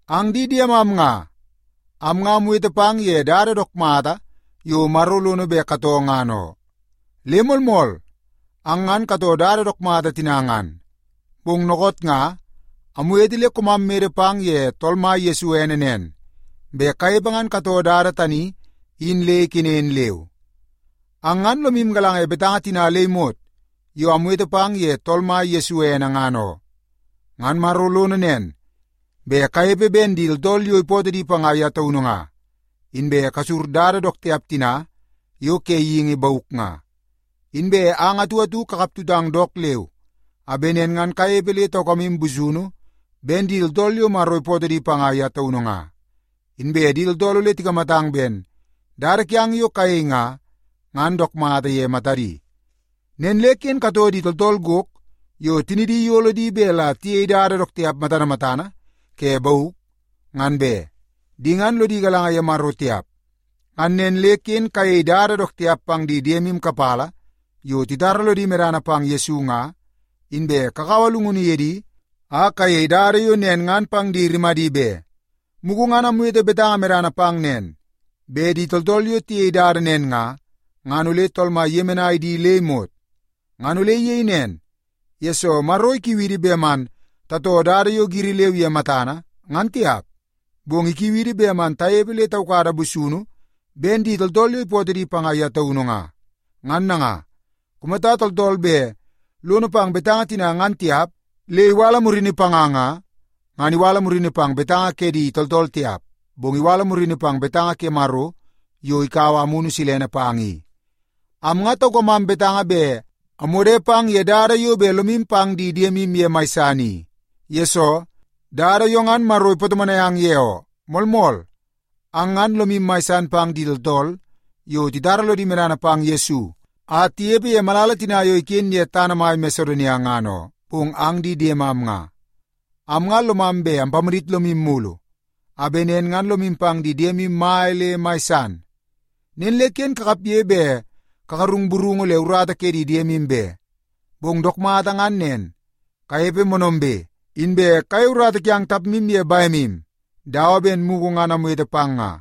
Ang di diemam nga, am nga amwete pang ye dada dook mata yo Maro lono bet katoo ngan oo. Le moolmool, ang ngan katoo dada dook mata tina ngan. Bong dookoot nga, amwete le koomam mede pang ye Tool Mai Yesu ene nen, bet kanepe ngan katoo dada tani in le ikenen leu. Ang ngan lomu galanga ye betanga tina le imot yo amwete pang ye Tool Mai Yesu ene ngan oo. Ngan Maro lono nen, bet kanepe ben di tooltool yo ipootoo di panga ye taunu nga, inbe kasur dada dook tiap tina yo ke geingi bauk nga. Inbe ang atu atu kakap tutang dook leu a bet nen ngan kanepe le taukamu busunu ben di tooltool yo Maro ipootoo di panga ye taunu nga, inbe di tooltool ole tikamatang ben dada kiang yo kayei nga, ngan dook mata ye matadi. Nen le ken katoo di tooltool gok yo tinidi iyolo di bet la tiyei dada dook tiap matana matana ke bauk, ngan be. Di ngan lodi galanga ye Maro tiap. Ngan nen le ken kayei dada dook tiap pang di diede kapala yo titara lodi medana pang Yesu nga, inbe kakaua llungunu ye di a kayei dada yo nen ngan pang di rimadi be. Mugu ngan amwete betanga medana pang nen, bet di tooltool yo tiyei dada nen nga, ngan ole Tool Mai iyemenai di le imot. Ngan ole iyei nen, yesoo Maro ikiu idi bet man tatoo dada yo giri leu ye matana ngan tiap, bong ikiu idi bet man tanepe le taukada busunu ben di tooltool yo ipootoo di panga ye taunu nga. Ngan nanga, kumata tooltool bet lono pang betanga tina ngan tiap le iwala murini panga nga, ngan iwala murini pang betanga ke di tooltool tiap, bong iwala murini pang betanga ke Maro yo ikaua Amunu Silene pang i. Am nga taukamam betanga bet amwode pang ye dada yo bet lomu pang di diemu ye mai san i. Yesoo, dada yo ngan Maro ipatomonai ang ye oo. Moolmool, ang ngan lomu mai san pang di tooltool yo titara lodi medana pang Yesu a tinepe ye malala tina yo iken ye tana mai Masedonia ngan oo. Bong ang di diemam nga, am nga lomam bet ampamadit lomu mulu a bet nen ngan lomu pang di diemu mai le mai san. Nen le ken kakapge bet kagarung burungu le urata ke di diemu be. Bong dook mata ngan nen, kanepe moonoombe, inbe kayei urata kiang tapmu ye bemu dawa ben mugu ngan amwete pang nga.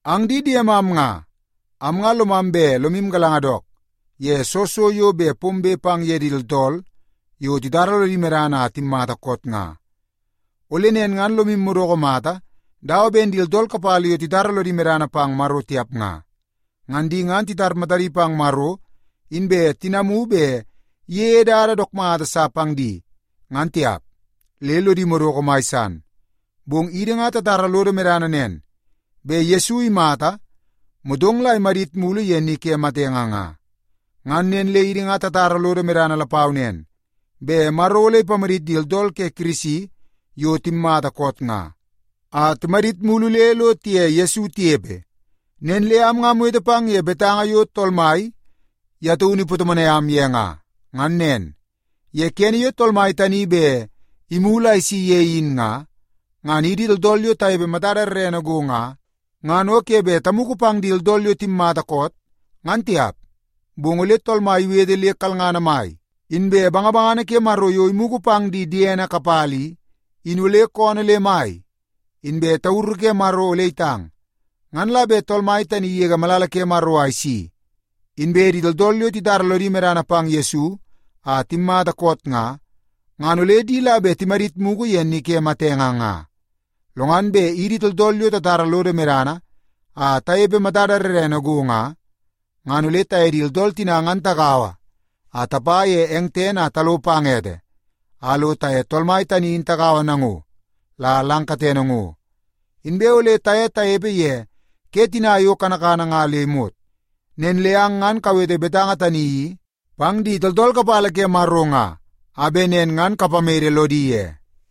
Ang di diemam nga, am nga lomam bet lomu galanga dook ye soo so yo bet pombe pang ye di tooltool yo titara lodi medana a timmata koot nga. Ole nen ngan lomu madoko mata dawa ben di tooltool kapala yo titara lodi medana pang Maro tiap nga. Ngan di ngan titar matadi pang Maro inbe tinamu bet iyeie dada dook mata sa pang di ngan tiap, le lodi madoko mai san. Bong idi nga tatara lodo medana nen, bet Yesu imata, motong la imadit mulu ye ni ke matenge nga. Ngan nen le idi nga tatara lodo medana lapau nen, bet Maro ole ipamadit di tooltool ke Kirisi yo timmata koot nga, a timadit mulu le lo tiye Yesu tinepe. Nen le am nga amwete pang ye betanga yo Tool Mai ye taunu ipatomonai am ye nga. Ngan nen, ye kene yo Tool Mai tani bet imulu a isi ye in nga, ngan idi tooltool yo tanepe matada rrene go nga, ngan o ke bet tamugu pang di tooltool yo timatamata koot, ngan tiap. Bong ole Tool Mai iwete le kalngana mai, inbe bangabangana ke Maro yo imugu pang di diene kapala i, in ole koonoo le mai, inbe tauru ke Maro ole itang. Ngan la bet Tool Mai tani igege malala ke Maro a isi, inbe di tooltool yo titara lodi medana pang Yesu a timmata koot nga, ngan ole di la bet timadit mugu ye ni ke matenge nga. Lo ngan bet idi tooltool yo tatara lodo medana a tanepe matada rrene go nga, ngan ole taye di tooltool tina ngan tagaua a tapa ye eng tene a talo pang ete a lo taye Tool Mai tani in tagaua nango la lang katene ngo. Inbe ole taye tanepe ye ke tina yo kanakana nga le imot. Nen le ang ngan kawete betanga tani i pang di tooltool kapala ke Maro nga, a bet nen ngan kapamede lodi ye.